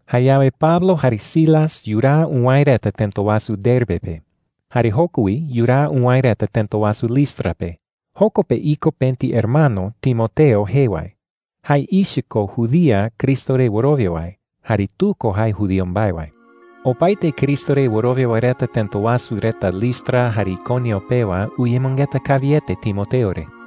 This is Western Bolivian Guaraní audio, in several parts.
Jayawe Pablo jare Silas yuraa uwäe reta tëta wasu Derbe pe. Jare joko wi yuraa uwäe reta tëta wasu Listra pe. Joko pe iko pëti hermano Timoteo jee wae. Jae ichɨ ko judía Cristo re wɨrowia wae, jare tu ko jae judío mbae wae. Opaete Cristo re wɨrowia wae reta tëta wasu reta Listra jare Iconio pewa uyemɨngeta kawiete Timoteo re.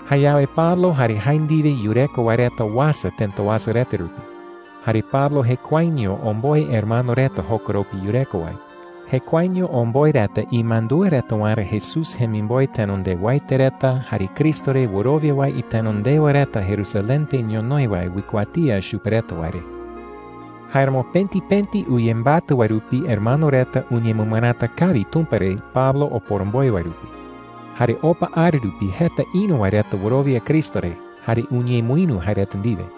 Jayawe Pablo jare jae ndiwe yureko wae reta uasa tëta wasu reta rupi. Jare Pablo jekuaeño omboe hermano reta jokoropi yureko wae. Jekuaeño omboe reta imandúa reta waerä Jesús jemimboe tenondewaete reta jare Cristo re wɨrowia wae itenondewa reta Jerusalén pe ñonoï wae uikuatía chupe reta wae re. Jáeramo pëti pëti uyembatɨ wae rupi hermano reta uñemɨmɨräta kawi Tumpa re Pablo oporomboe wae rupi. Jare opa ara rupi jeta ïru wae reta wɨrowia Cristo re jare uñemɨïru jae reta ndiwe.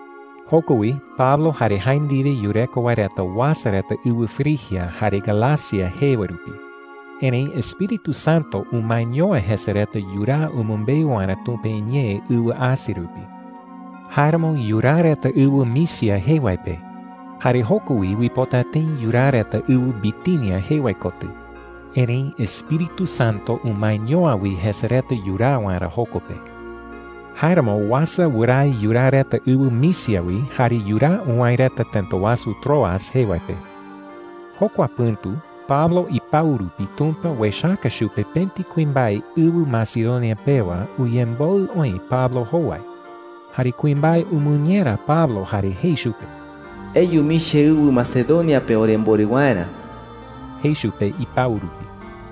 Joko wi Pablo jare jae ndiwe yureko wae reta uasa reta ɨwɨ Frigia jare Galacia jee wae rupi. Erëi Espíritu Santo umaeño’ä jese reta yuraa umɨmbeu waerä Tumpa iñee ɨwɨ Asia rupi. Jáeramo yuraa reta ɨwɨ Misia jee wae pe. Jare joko wi uipota tëi yuraa reta ɨwɨ Bitinia jee wae kotɨ. Erëi Espíritu Santo umaeño’ä wi jese reta yuraa waerä joko pe. Jáeramo uasa wɨrae yuraa reta ɨwɨ Misia wi jare yuraa uwäe reta tëta wasu Troas jee wae pe. Jokua pɨ̈tu Pablo ipau rupi Tumpa uechaka chupe pëti kuimbae ɨwɨ Macedonia pewa uyemboɨ oï Pablo jowai. Jare kuimbae umɨñera Pablo jare jei chupe: “Eyu mii cheɨwɨ Macedonia pe oremborɨ waerä,” jei chupe ipau rupi.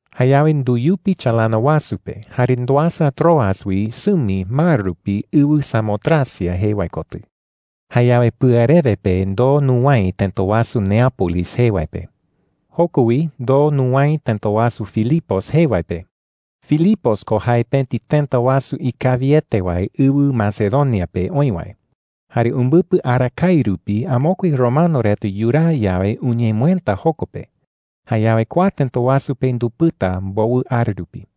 Jayawe nduyupi chalana wasu pe jare nduasa Troas wi sɨmi mar rupi ɨwɨ Samotracia jee wae kotɨ. Jayawe pɨarewe pe ndoo nuwäe tëta wasu Neápolis jee wae pe. Joko wi ndoo nuwäe tëta wasu Filipos jee wae pe. Filipos ko jae pëti tëta wasu ikawiete wae ɨwɨ Macedonia pe oï wae, jare umbɨpɨ arakae rupi amokue romano reta yuraa yawe uñemɨëta joko pe. Jayawe kua tëta wasu pe ndupɨta mbowɨ ara rupi.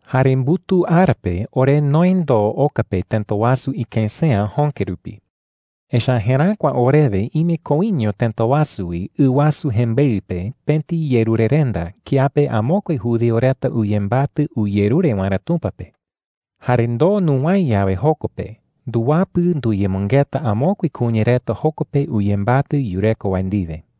Jare mbutuu ara pe ore noë ndoo oka pe tëta wasu ikësea jöke rupi. Echa’ä jeräkua orewe ime koiño tëta wasu wi ɨ wasu jembeɨ pe pëti yerurerenda kiape amokue judío reta uyembatɨ uyerure waerä Tumpa pe. Jare ndoo nuwäe yawe joko pe, nduwapɨ nduyemɨngeta amokue kuña reta joko pe uyembatɨ yureko wae ndiwe.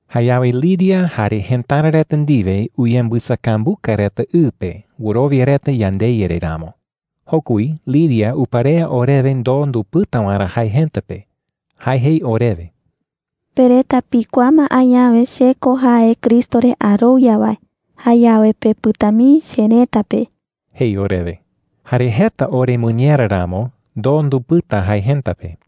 Jayawe Lidia jare jëtara reta ndiwe uyembɨsakambuka reta ɨ pe wɨrowia reta yandeYa re ramo. Joko wi Lidia uparea orewe ndoo ndupɨta waerä jae jëta pe. Jae jei orewe: “Pe reta pikuaa ma añawe che ko jae Cristo re arowia wae. Jayawe pepɨta mii cherëta pe,” jei orewe. Jare jeta oremɨñera ramo, ndoo ndupɨta jae jëta pe.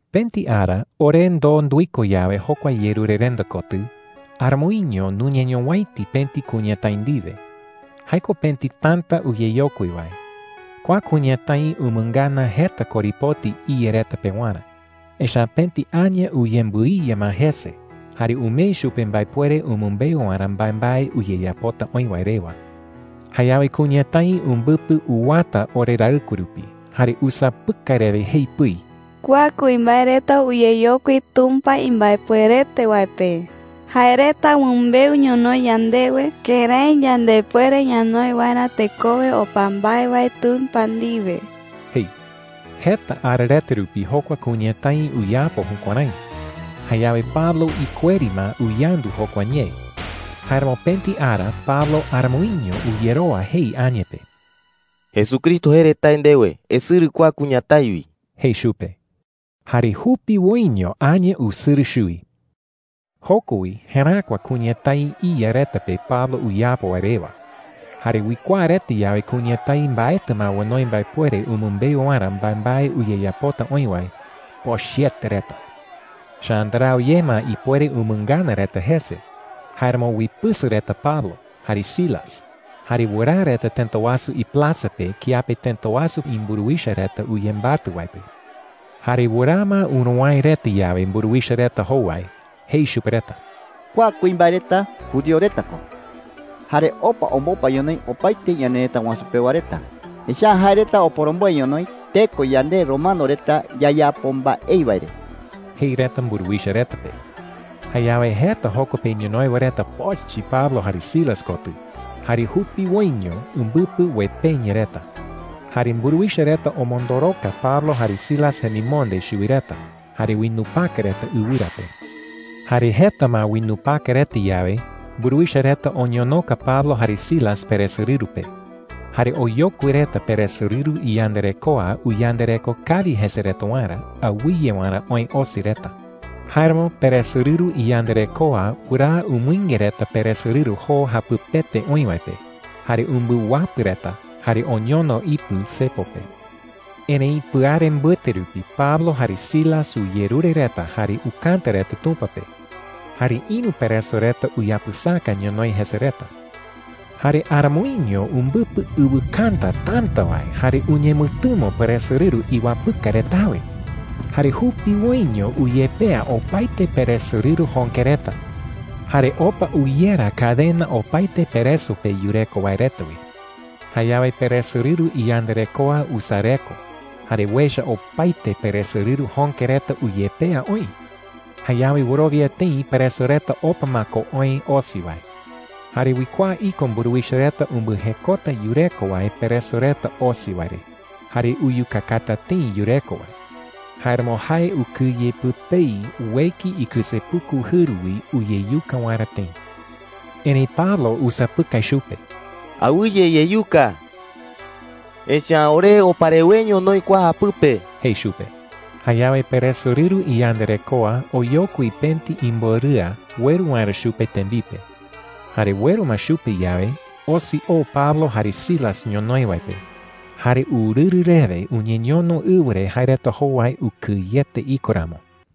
Pëti ara ore ndoo nduiko yawe jokua yerurerenda kotɨ, aramoiño nuñeñowäiti pëti kuñatái ndiwe. Jae ko pëti täta uyeyokui wae. Kua kuñatái umɨngana jeta korepoti iya reta pewarä, echa’ä pëti aña uyembɨiya ma jese jare umee chupe mbaepuere umɨmbeu waerä mbaembae uyeyapota oï wae rewa. Jayawe kuñatái umbɨpɨ uwata oreraɨkue rupi, jare usapɨkai rewe jei pɨi: “Kua kuimbae reta uyeyokui Tumpa imbaepuerete wae pe. Jae reta umɨmbeu ñonoï yandewe kërái yandepuere ñanoi waerä tekowe opa mbae wae Tumpa ndiwe,” jei. Jeta ara reta rupi jokua kuñatái uyapo jukuärái. Jayawe Pablo ikueri ma uyandu jokua ñee. Jáeramo pëti ara Pablo aramoiño uyerowa jei aña pe: “Jesucristo jee re tae ndewe: ¡Esɨrɨ kua kuñatái wi!” jei chupe. Jare jupiwoiño aña usɨrɨ chuwi. Joko wi jeräkua kuñatái iya reta pe Pablo uyapo wae rewa. Jare uikuaa reta yawe kuñatái mbaetɨ ma onoi mbaepuere umɨmbeu waerä mbaembae uyeyapota oï wae, pochɨete reta. Echa’ä ndarau ye ma ipuere umɨngana reta jese. Jáeramo uipɨsɨ reta Pablo jare Silas, jare wɨraa reta tëta wasu iplaza pe kiape tëta wasu imburuwicha reta uyembatɨ wae pe. Jare wɨraa ma uruwäe reta yawe mburuwicha reta jowai, jei chupe reta: “Kua kuimbae reta judío reta ko, jare opa ombopa ñonoï opaete ñanerëta wasu pewa reta. Echa’ä jae reta oporomboe ñonoï teko yande romano reta yayapo mbaei wae re,” jei reta mburuwicha reta pe. Jayawe jeta joko pe ñonoï wae reta pochɨ Pablo jare Silas kotɨ, jare jupiwoiño umbɨpɨ uepeña reta. Jare mburuwicha reta omondoroka Pablo jare Silas jemimonde chuwi reta jare uinupaka reta ɨwɨra pe. Jare jeta ma uinupaka reta yawe, mburuwicha reta oñonoka Pablo jare Silas peresorɨru pe. Jare oyokui reta peresorɨru iyandarekoa uyandareko kawi jese reta waerä, awɨye waerä oë osi reta. Jáeramo peresorɨru iyandarekoa wɨraa umɨinge reta peresorɨru joo japɨpete oï wae pe, jare umbɨwapɨ reta, jare oñono ipɨ cepo pe. Erëi pɨare mbɨte rupi Pablo jare Silas uyerure reta jare ukäta reta Tumpa pe. Jare ïru pereso reta uyapɨsaka ñonoï jese reta. Jare aramoiño umbɨpɨ ɨwɨkäta täta wae jare uñemɨtɨmo peresorɨru iwapɨka retawe. Jare jupiwoiño uyepea opaete peresorɨru jöke reta, jare opa uyera cadena opaete pereso pe yureko wae reta wi. Jayawe peresorɨru iyandarekoa usareko jare uecha opaete peresorɨru jöke reta uyepea oï. Jayawe wɨrowia tëi pereso reta opa ma ko oë osi wae. Jare uikuaa iko mburuwicha reta umbɨjekota yureko wae pereso reta osi wae re, jare uyukakata tëi yureko wae. Jáeramo jae ukɨye pɨpei ueki ikɨsepuku jɨru wi uyeyuka waerä tëi. Erëi Pablo usapɨkai chupe: “¡Awɨye iyeyuka!” jei. “Echa’ä ore opa reweño noï kua japɨpe,” jei chupe. Jayawe peresorɨru iyandarekoa oyokui pëti imborɨa ueru waerä chupe tembipe. Jare ueru ma chupe yawe, osi oo Pablo jare Silas ñonoï wae pe. Jare urɨrɨ rewe uñeñono ɨwɨ re jae reta jowai ukɨyete iko ramo.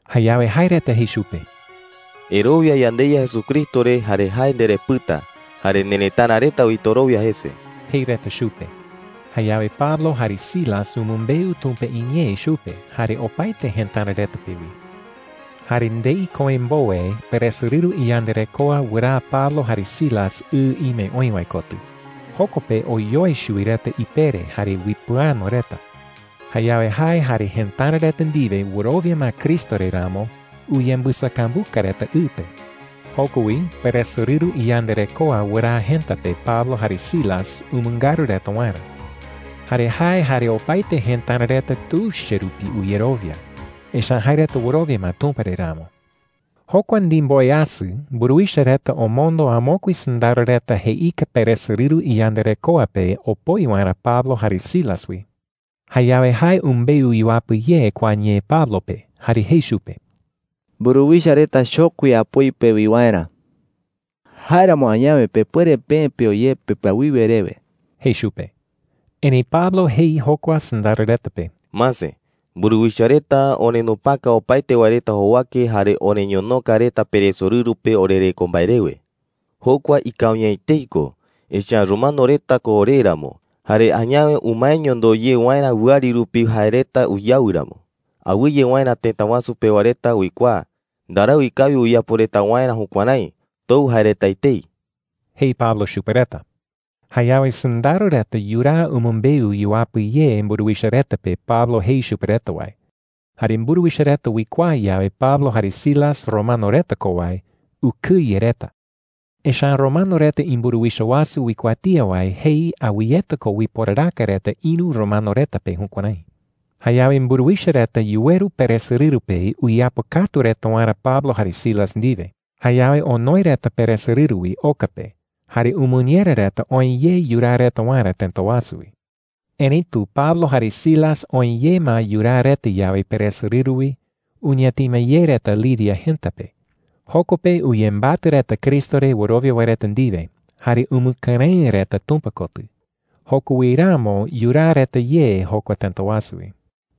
Jayawe jae reta jei chupe: “Erowia yandeYa Jesucristo re jare jae nderepɨta. Jare nerëtara reta wi torowia jese,” jei reta chupe. Jayawe Pablo jare Silas umɨmbeu Tumpa iñee chupe jare opaete jëtara reta pe wi. Jare ndei köe mbowe peresorɨru iyandarekoa wɨraa Pablo jare Silas ɨ ime oï wae kotɨ. Joko pe oyoe chuwi reta ipere jare uipɨano reta. Jayawe jae jare jëtara reta ndiwe wɨrowia ma Cristo re ramo, uyembɨsakambuka reta ɨ pe. Joko wi peresorɨru iyandarekoa wɨraa jëta pe Pablo jare Silas umɨngaru reta waerä. Jare jae jare opaete jëtara reta tuicha rupi uyerowia, echa’ä jae reta wɨrowia ma Tumpa re ramo. Jokua ndimboweasɨ, mburuwicha reta omondo amokue sɨndaro reta jeika peresorɨru iyandarekoa pe opoi waerä Pablo jare Silas wi. Jayawe jae umbeu yuapɨ ye kua ñee Pablo pe jare jei chupe: “Mburuwicha reta chokui apoi pewi waerä,” jei. “Jáeramo añawe pepuere peë peo ye pepɨawiwe rewe,” jei chupe. Erëi Pablo jei jokua sɨndaro reta pe: “Mase, mburuwicha reta orenupaka opaete wae reta jowake jare oreñonoka reta peresorɨru pe orereko mbae rewe,” jei. “Jokua ikawi’ä etei ko, echa’ä romano reta ko ore ramo. Jare añawe umaeño ndoo ye waerä wɨari rupi jae reta uyawɨ ramo, awɨye waerä tëta wasu pewa reta uikuaa. Ndarau ikawi uyapo reta waerä jukuärái. Tou jae reta etei,” jei Pablo chupe reta. Jayawe sɨndaro reta yuraa umɨmbeu yuapɨ ye mburuwicha reta pe Pablo jei chupe reta wae. Jare mburuwicha reta uikuaa yawe Pablo jare Silas romano reta ko wae, ukɨye reta. Echa’ä romano reta imburuwicha wasu uikuatía wae jei awɨyeta ko uiporaraka reta ïru romano reta pe jukuärái. Jayawe mburuwicha reta yuweru peresorɨru pe uyeapɨkatu reta waerä Pablo jare Silas ndiwe. Jayawe onoe reta peresorɨru wi oka pe jare umɨñera reta oë ye yuraa reta waerä tëta wasu wi. Erëitu Pablo jare Silas oë ye ma yuraa reta yawe peresorɨru wi, uñatima ye reta Lidia jëta pe. Joko pe uyembatɨ reta Cristo re wɨrowia wae reta ndiwe, jare umɨkɨrëɨ reta Tumpa kotɨ. Joko wi ramo yuraa reta ye jokua tëta wasu wi.